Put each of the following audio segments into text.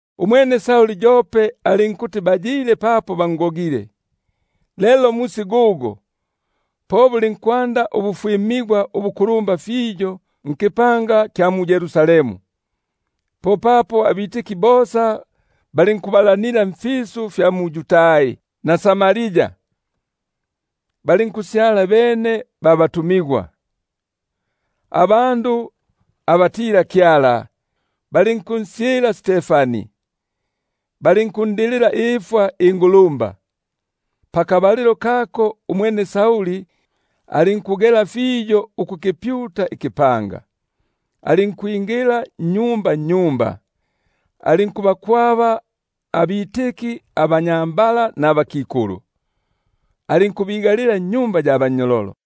Umwene Sauli yope alinkuti bayile apa bangogile. Lelo musi gugo, po bulinkwanda ubufwimigwa ubukulumba nkipanga kya mu-Yerusalemu; popapo bosa balinkubalanila mfisu fya mu-Yudai na Samaria, balinkusyala bene ba batumigwa. Abandu abatila-Kyala balinkunsyila Stefani, balinkundilila ifwa ingulumba. Umwene Sauli loli alinkukyonanga ikipanga, alinkwingila nnyumba nnyumba, alinkubakwaba abanyambala nabakikulu nukubigalila nnyumba ya bannyololo.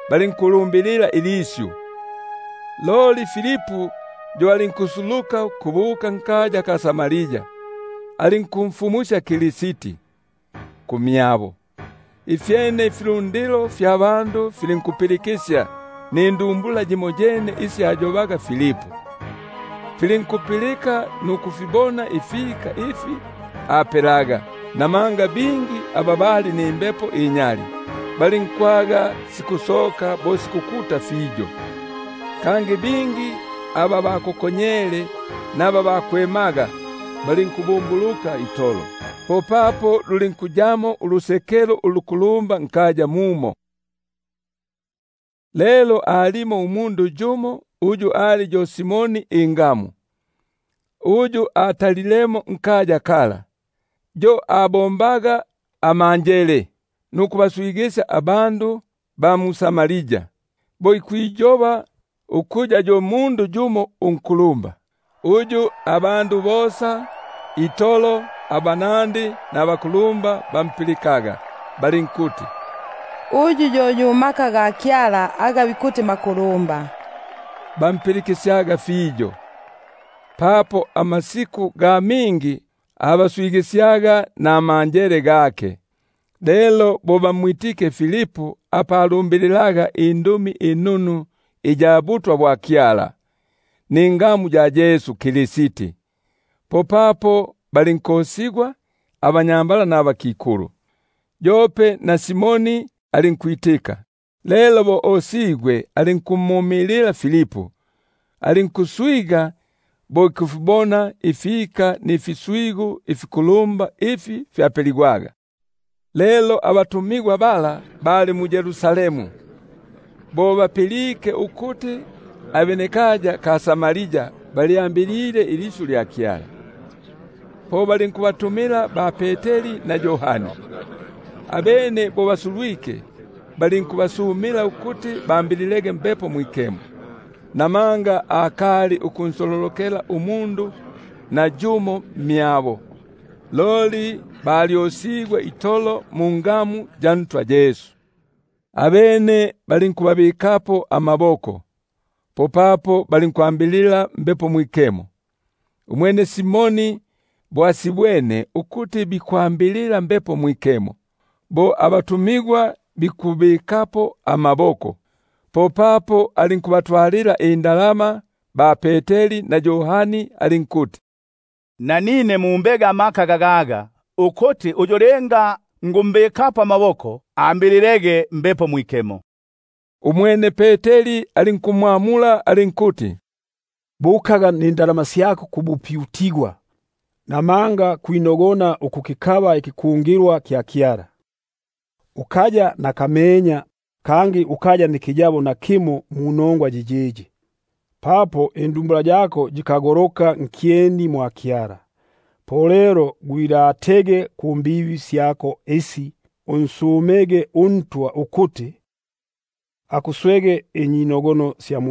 fumusya ilisyu. Loli Filipu yo alinkusuluka ukubuka nkaya ka Samaria, alinkumfumusya Kristi kumyabo. Ifyene ifilundilo filinkupilikisya nindumbula yimoyene isi ayobaga Filipu, filinkupilika nukufibona ifika ifi apelaga. Namanga bingi aba bali nimbepo inyali, balinkwaga sikusoka bo sikukuta fiyo; kangi bingi aba bakokonyele naba bakwemaga balinkubumbuluka itolo. Popapo lulinkuyamo ulusekelo ulukulumba nkaya mumo. Lelo alipo umundu yumo uyu ali yo Simoni ingamu, uyu atalilemo nkaya kala, yo abombaga amanjele nukubaswigisya abandu ba mu-Samaria, bo ikwiyoba ukuya yo mundu yumo unkulumba; uyu bosa itolo abanandi nabakulumba bampilikaga, balinkuti: Uyu yo yu maka ga Kyala aga bikuti maku- lumba; balinkumpilikisya, papo amasiku ga mingi abaswigi- syaga namanjele gake. Lelo bo bamwitike Filipu, apa alumbililaga inongwa inunu sya butwa bwa Kyala ningamu ya Yesu Kristi, popapo balinkosigwa abanyambala nabakikulu. Yope na Simoni alinkwitika; lelo bo osigwe alinkumumilila Filipu, alinkuswiga bo ikufibona ifika mfiswigu ifikulumba ifi fyapeligwaga. Lelo bo abatumigwa aba mu-Yerusalemu bapilike ukuti ikya mu-Samaria kilyambilile ilisyu lya Kyala, po balinku- batumila ba-Peteri na Yohani. Abene bo basulwike, balinku- basumila ukuti bambililege Mbepo Mwikemo, namanga akali ukunsololokela nayumo mmyabo, loli balyokesigwe itolo mungamu ya Ntwa Yesu. Abene balinkubabikapo amaboko, popapo balinkwambilila Mbepo Mwikemo. Umwene Simoni bo asibwene ukuti bikwambilila Mbepo Mwikemo, bo abatumigwa bikubabikapo amaboko, popapo alinkubatwalila inda- lama, alinkuti: Nanine mumbege amaka gagaga, ukuti uyu linga nikumbikapo amaboko, ambililege Mbepo Mwikemo. Umwene Peteri alinkumbula alinkuti: Bukaga nindalama syako kubupyutigwa, namanga kwinogona ukukikaba ikiku- ngilwa kya Kyala nindalama. Ukaya nakamenya, kangi ukaya nakayabo munongwa yiyiyi, papo indumbula yako yikagoloka nkyeni mwa Kyala. Upindukege lelo kububibi bwako bububu, unsumege uNtwa ukuti akuswege inyinogono sya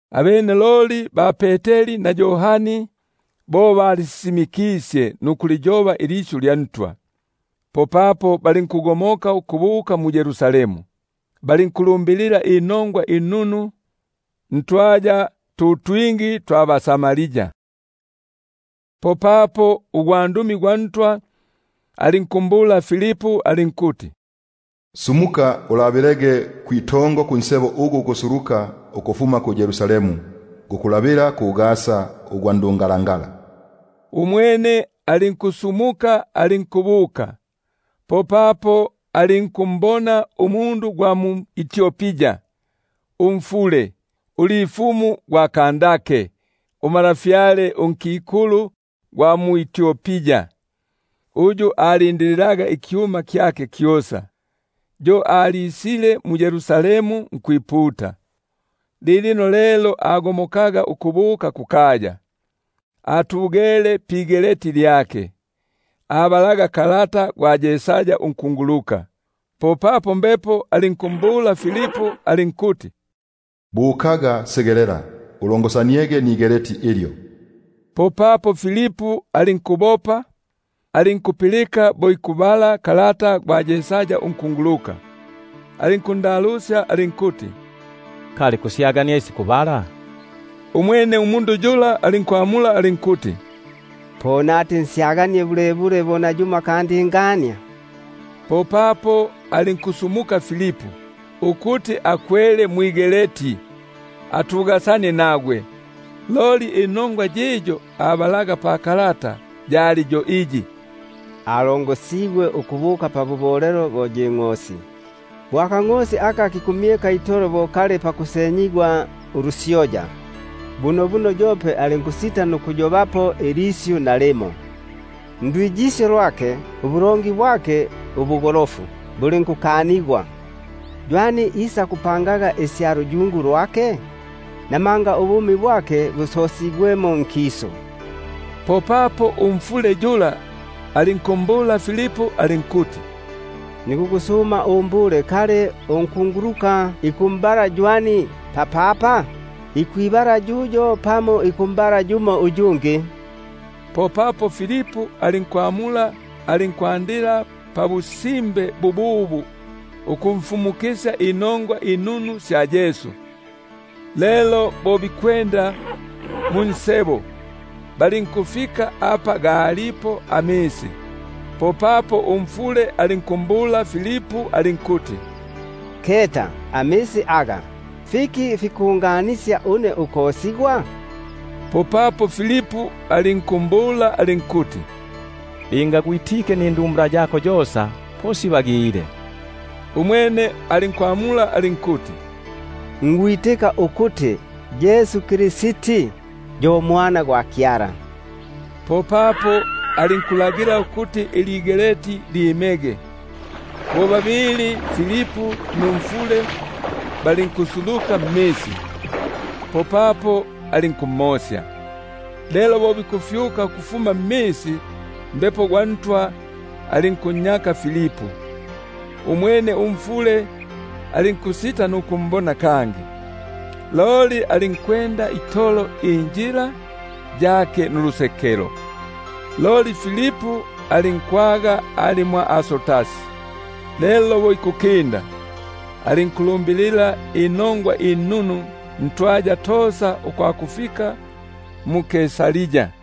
Abene loli bo balisisimikisye nukuliyoba ilisyu lya Ntwa, popapo balinkugomoka ukubuka mu-Yerusalemu, balinkulumbilila inongwa inunu ntwaya tu twingi twa baSamaria. Popapo ugwandumi gwa Ntwa alinkumbula Filipu alinkuti: Sumukaga ulabilege kwitongo kunsebo ugu gukusuluka ukufuma ku-Yerusalemu, gukulabila ku-Gaza, ugwa ndungala- ngala. Umwene alinkusumuka alinkubuka; popapo alinkumbona umundu gwa mu-Etiopia, umfule, ulifumu gwa Kandake umalafyale unkikulu gwa bʼEtiopia, uyu alindililaga ikyuma kyake kyosa, yo alisile mu-Yerusalemu nkwiputa; lilino lelo agomokaga ukubuka kukaya, atugele pigeleti lyake, abalaga kalata gwa Yesaya unkunguluka. Popapo Mbepo alinkumbula Filipu alinkuti: Bukaga segelela, ulongosaniege nigeleti ilyo. Popapo Filipu alinkubopa, alinkupilika bo ikubala kalata gwa Yesaya unkunguluka, alinkundalusya alinkuti: Kali kusyagania isi kubala? Umwene alinkuti: Po nati nsyaganie bulebule bo nayumo akandingania? Popapo alinkunsuma Filipu ukuti akwele, atugasanie nagwe. Loli inongwa iyi abalaga pakalata yali yo iyi: Alongosigwe ukubuka pabubolelo bo yi ngʼosi, Bo akangʼosi aka kikumyeka itolo nkyeni munsenyalusyoya, Bunobuno yope alinkusita nukwinula imilomo gyake. Ndwiyisyo lwake, ubulongi bwake ubugolofu bulinkukanigwa, Ywani isakupanga isya luyungu lwake? Buno ubumi bwake busosigwemo nkisu. Popapo umfule alinkumbula Filipu alinkuti: Nikukusuma, kali unkunguluka ikumbala ywani papapa? Ikwibala yuyo pamo ikumbala yumo uyungi? Popapo Filipu alinkwinula imilomo gyake, alinkwanda pabusimbe bububu ukumfumu- kisya inongwa inunu sya Yesu. Lelo bo bikwenda munsebo, balinkufika apa galipo amisi; popapo umfule alinkumbula alinkuti: Keta, amisi aga, fiki fikunganisyaga ukosigwa? [Popapo Filipu alinkumbula alinkuti: Linga gwitike nindumbula yako yosa, po sibagile. Umwene alinkwamula alinkuti: Nikwitika ukuti Yesu Kristi yo yu Mwana gwa Kyala.] Popapo alinkulagila ukuti iligeleti lyimege; bo babili, Filipu numfule balinkusuluka mmisi, popapo alinkumosya. Lelo bo bikufyuka ukufuma mmisi, Mbepo gwa Ntwa alinkunnyaka Filipu, umwene umfule alinkusita nukumbona kangi, loli alinkwenda itolo injila yake nulusekelo. Loli Filipu alinkubonekela mwa Azoti, lelo bo ikukinda, alinkufumusya inongwa inunu ntwaya tosa ukwakufika mu-Kaisaria.